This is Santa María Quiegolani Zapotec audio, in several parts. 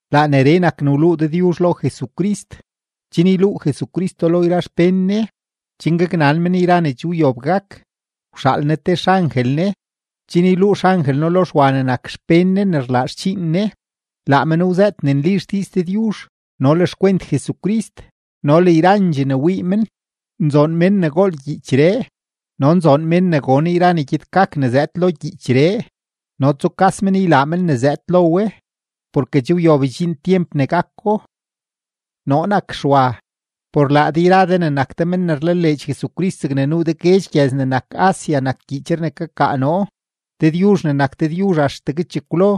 Laa neree nak ne wluu Dëdyuzh lo Jesucrist, chen yluu Jesucristo lo yra xpén Ne, chen gaknan men yra ne che wyob gak. Wxaal Ne te xangel Ne, chen yluu xangel No lo Xwa ne nak xpén Ne ne rlaa xdxiin Ne. Laa men wzëët ne nli xdiiz Dëdyuzh no le xkwent Jesucrist no le yrandxee ne wii men. Nzoon mén ne gool gyiichree, no nzoon mén ne gon yra ne gyed gak ne zëëd lo gyiichree no ne tsukas men ylaa men ne zëëd lo we porke che wyob ydxiin tyemp ne gako. Noo nak Xwa, por laa de yra de ne nak de men ne rlaleedx Jesucrist zegne nuu de guedx gyëz ne nak Asia nak gyiichree ne kakaa noo. Dëdyuzh ne nak Dëdyuzh axtegue chekwlo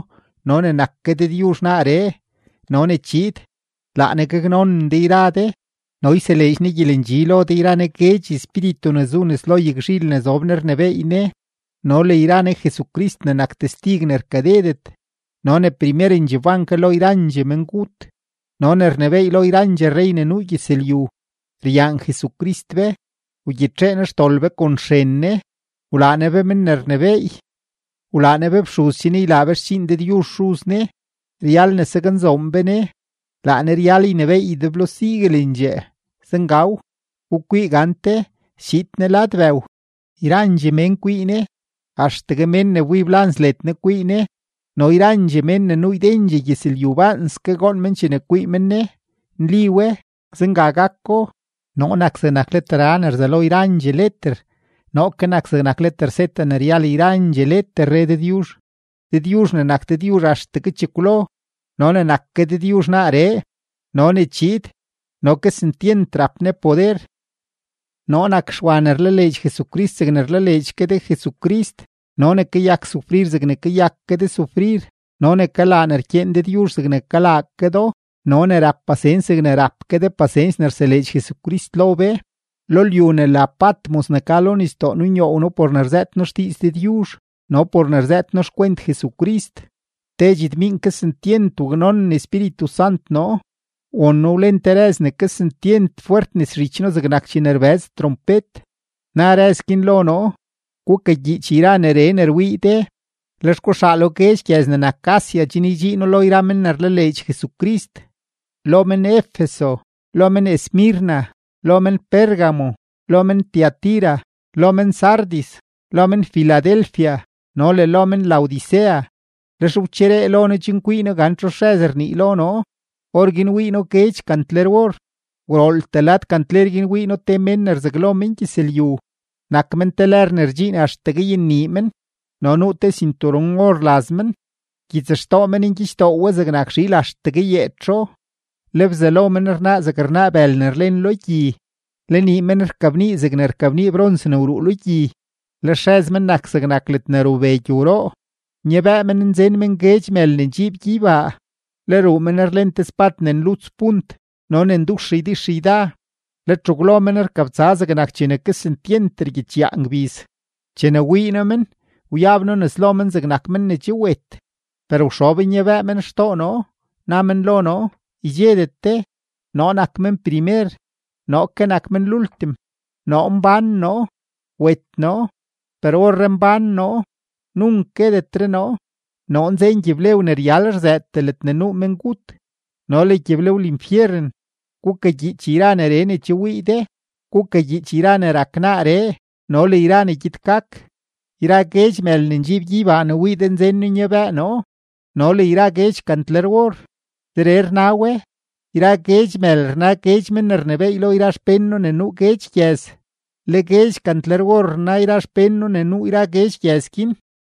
no ne nak ke Dëdyuzh naaree no ne chiid, laa Ne gaknonen de yra de no yseleedx Ne gyelendxi lo de yra Ne guedx espíritu ne zu nes lo yagzhil ne zob Ne rnebééy Ne, no le yra Ne Jesucrist ne nak testig ne rkadedet no ne primerendxee wban ke lo yrandxee mengut no ne rnebééy lo yrandxee rrey ne nuu gyëzlyu. Ryaan Jesucrist be, wgyitxee Ne xdol be kon xren Ne, wlaa Ne be men ne rnebééy, wlaa Ne be fxuz chen ylaa be xdxiin Dëdyuzh Xuz Ne. Ryal Ne ne saknzoon be Ne, laa Ne ryal ynebééy ydeblo siguelendxee. Zengaw. Gukwii gante, schiid Ne lad bëw; yrandxee mén kwii Ne, axtegue mén ne wbib lans led Ne kwii Ne, no yrandxee mén ne nuu ydendxee gyëzlyu baanske goon men chene kwii men Ne. Nli we, zenga gako. “Noo nak zegnak leter A ne rzelo yrandxee leter, noo ke nak zegnak leter Z ne ryal yrandxee leter”, re Dëdyuzh, Dëdyuzh ne nak Dëdyuzh axtegue chekwlo no ne nak ke Dëdyuzh naaree no ne chiid no kesentyent rap Ne poder. Noo nak Xwa ne rlaleedx Jesucrist zegne rlaleedx ke de Jesucrist no ne kayak sufrir zegne kayak ke de sufrir no ne kalaa ne rkyeen Dëdyuzh zegne kalaa ke do no ne rap pasens zegne rap ke de pasens ne rseleedx Jesucrist lo be. Lo lyu ne la Patmos ne ka lo nisdoo nunyoow noo por ne rzëët noo xdiiz Dëdyuzh no por ne rzëët noo xkwent Jesucrist. Te dxetmiink kesentyent waknonen Espíritu Sant noo, won noo wlen te rëz ne kesentyent fwert nes zhich noo zegnak chene rbëz trompet, na rëz guin lo noo: ―Gukagyiich yra neree ne rwii de, lex guxaalo guedx gyëz ne nak Asia chen ydxiino lo yra men ne rlaleedx Jesucrist: lo men-Efeso, lo men-Esmirna, lo men-Pérgamo, lo men-Tiatira, lo men-Sardis, lo men-Filadelfia, no le lo men-Laodicea. Lex wcheree lo noo chen kwii noo gan txu xrëz rnii lo noo, orguin wii noo guedx kantler-or. Gwrooltee lad kantler guin wii noo te mén ne rzaglo mengyëzlyu; nak men te lër ne rdxiin axtegue yennii men, no nuu te sinturon-or laz men. Gyitsxtoo men ngyichdoo we zegnak zhiil axtegue yeetxo; le bzalo men rnaa zeg rnaa bël ne rlen lo gyi; le nii men rkabnii zeg rkabnii brons ne wruu lo gyi; le xrëz men nak zegnak ledne rube gyowroo. Nyabëë men nzen men guedx mël ne ndxiib gyeybaa; le ruu men rlen te spad ne nluts punt no ne ndux ydixyda; le txegwlo men rkabtsa zegnak chene kesentyent rgyiichyaa ngbiz. Chene wii noo men, wyab noo nes lo men zegnak men ne che wet; per wxob nyabëë men xtoo noo, na men lo noo: ―Ydxedet de. Noo nak men primer, noo ke nak men lultim. Noo mbán noo; wet noo, per orree mbán noo; nunk guetetre noo. Noo nzen gyiblew ne ryal rzëëtee ledne nuu mengut no le gyiblew linfyeren. Gukagyiich yra neree ne che wii de, gukagyiich yra ne rak naaree no le yra ne gyed gak. Yra guedx mël ne ndxiib gyeybaa ne wii de nzen noo nyabëë noo no le yra guedx kantler-or, zeree rna we: yra guedx mël rna guedx men ne rnebééy lo yra xpén noo ne nuu guedx gyëz, le guedx kantler-or rna yra xpén noo ne nuu yra guedx gyëz guin.